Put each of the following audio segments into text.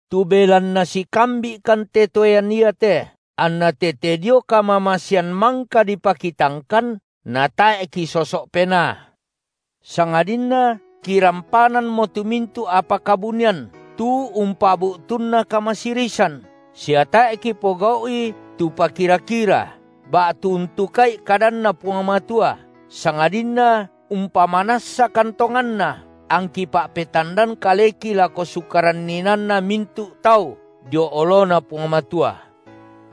Tu belanna sikambi’kan te toean iate, anna tete dio kamamasean mangka dipakitangkan, natae’ kisoso’ penaa, sangadinna kirampanammo tu mintu’ apa kabunian, tu umpabu’tunna kamasirisan, sia tae’ kipogau’i tu pakira-kira ba’tu untuka’i kadanNa Puang Matua, sangadinna umpamanassakan tonganna, angki pa’petandan kaleki lako sukaran inaanna mintu’ tau dio oloNa Puang Matua.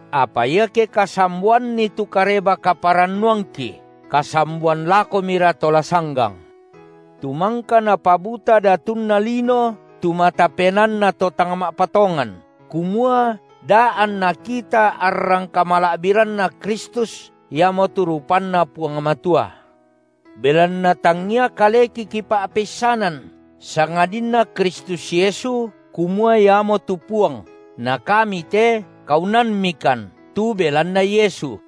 Apa iake kasamboanni tu Kareba-kaparannuangki, kasamboan lakomira to la sanggang, tu mangka napabuta datunna lino tu mata penaanna to tang ma’patongan, kumua da anna kita arrang kamala’biranNa Kristus iamotu rupanNa Puang Matua. Belanna tangia kaleki kipa’peissanan, sangadinna Kristus Yesu, kumua Iamotu Puang, na kami te kaunanmikan tu belanna Yesu.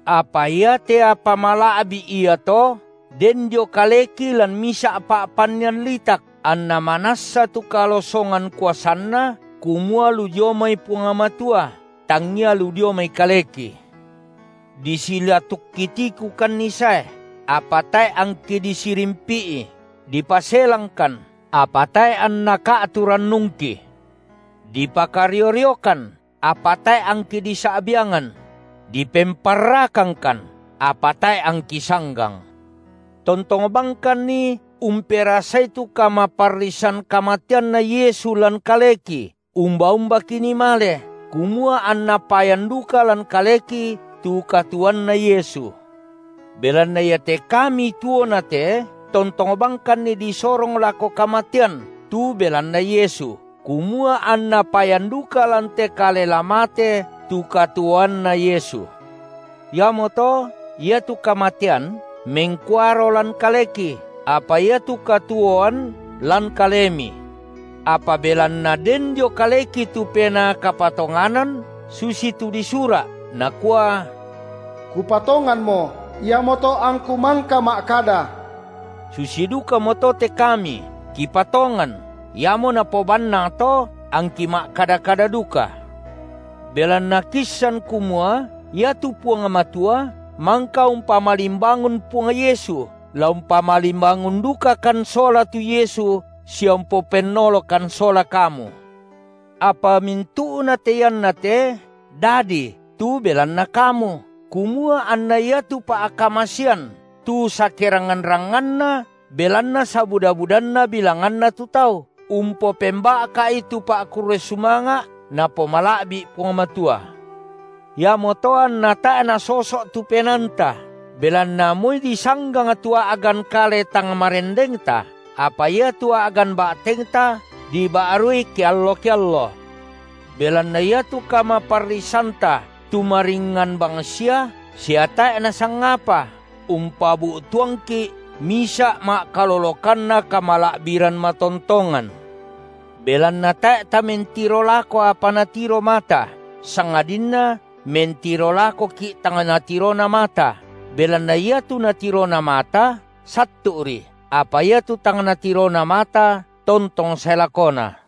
Apa iate apa mala’bi’ iato den dio kaleki lan misa’ pa’pannian litak, anna manassa tu kalosongan kuasanna kumua lu dio mai Puang Matua, tangngia lu dio mai kaleki. Disilatukki tikukanni sae, apa tae’ angki disirimpi’i, dipaselangkan, apa tae’ anna ka’tu rannungki; dipakario-riokan apa tae’ angki disa’biangan; dipemparrakangkan apa tae’ angki sanggang. Tontong bangkanni umperasai tu kamaparrisan kamateanNa Yesu lan kaleki umba-umba kinii male, kumua anna payan duka lan kaleki tu katuoanNa Yesu. Belanna iate kami tuona te tontong bangkanni disorong lako kamatean tu belanna Yesu, kumua anna payan duka lan te kale la mate tu katuoanNa Yesu. Iamoto iatu kamatean mengkuaro lan kaleki, apa iatu katuoan lan kalemi. Apa belanna den dio kaleki tu Penaa kapatonganan, susitu disura’, nakua: Kupatonganmo, iamoto angku mangka ma’kada; susi dukamoto te kami kipatongan, iamo napobannangto angki ma’kada-kada duka. Belanna kiissan kumua iatu Puang Matua mangka umpamalimbangun Puang Yesu la umpamalimbangun dukakan sola tu Yesu sia umpopennolokan sola kamu. Apa mintu’nate iannate dadi tu belanna kamu, kumua anna iatu pa’kamasean tu sakerangngan-rangnganna belanna sabuda-budanna bilanganna tu tau, umpopemba’ka’i tu pa’kurre sumanga’ Napomala’bi’ Puang Matua. Iamoto anna tae’ nasoso’ tu penaanta, belanna moi disanggang tu a’gan kale tang marendengta, apa iatu a’gan ba’tengta diba’rui keallo-keallo. Belanna iatu kamaparrisanta tu maringngan bangsia sia tae’ nasangapa, umpabu’tuangki’ misa’ ma’kalolokanna kamala’biran matontongan, belanna tae’ tamentiro lako apa natiro mata, sangadinna mentiro lakoki’ tang natirona mata, belanna iatu natirona mata sattu’ri, apa iatu tang natirona mata tontong sae lakona.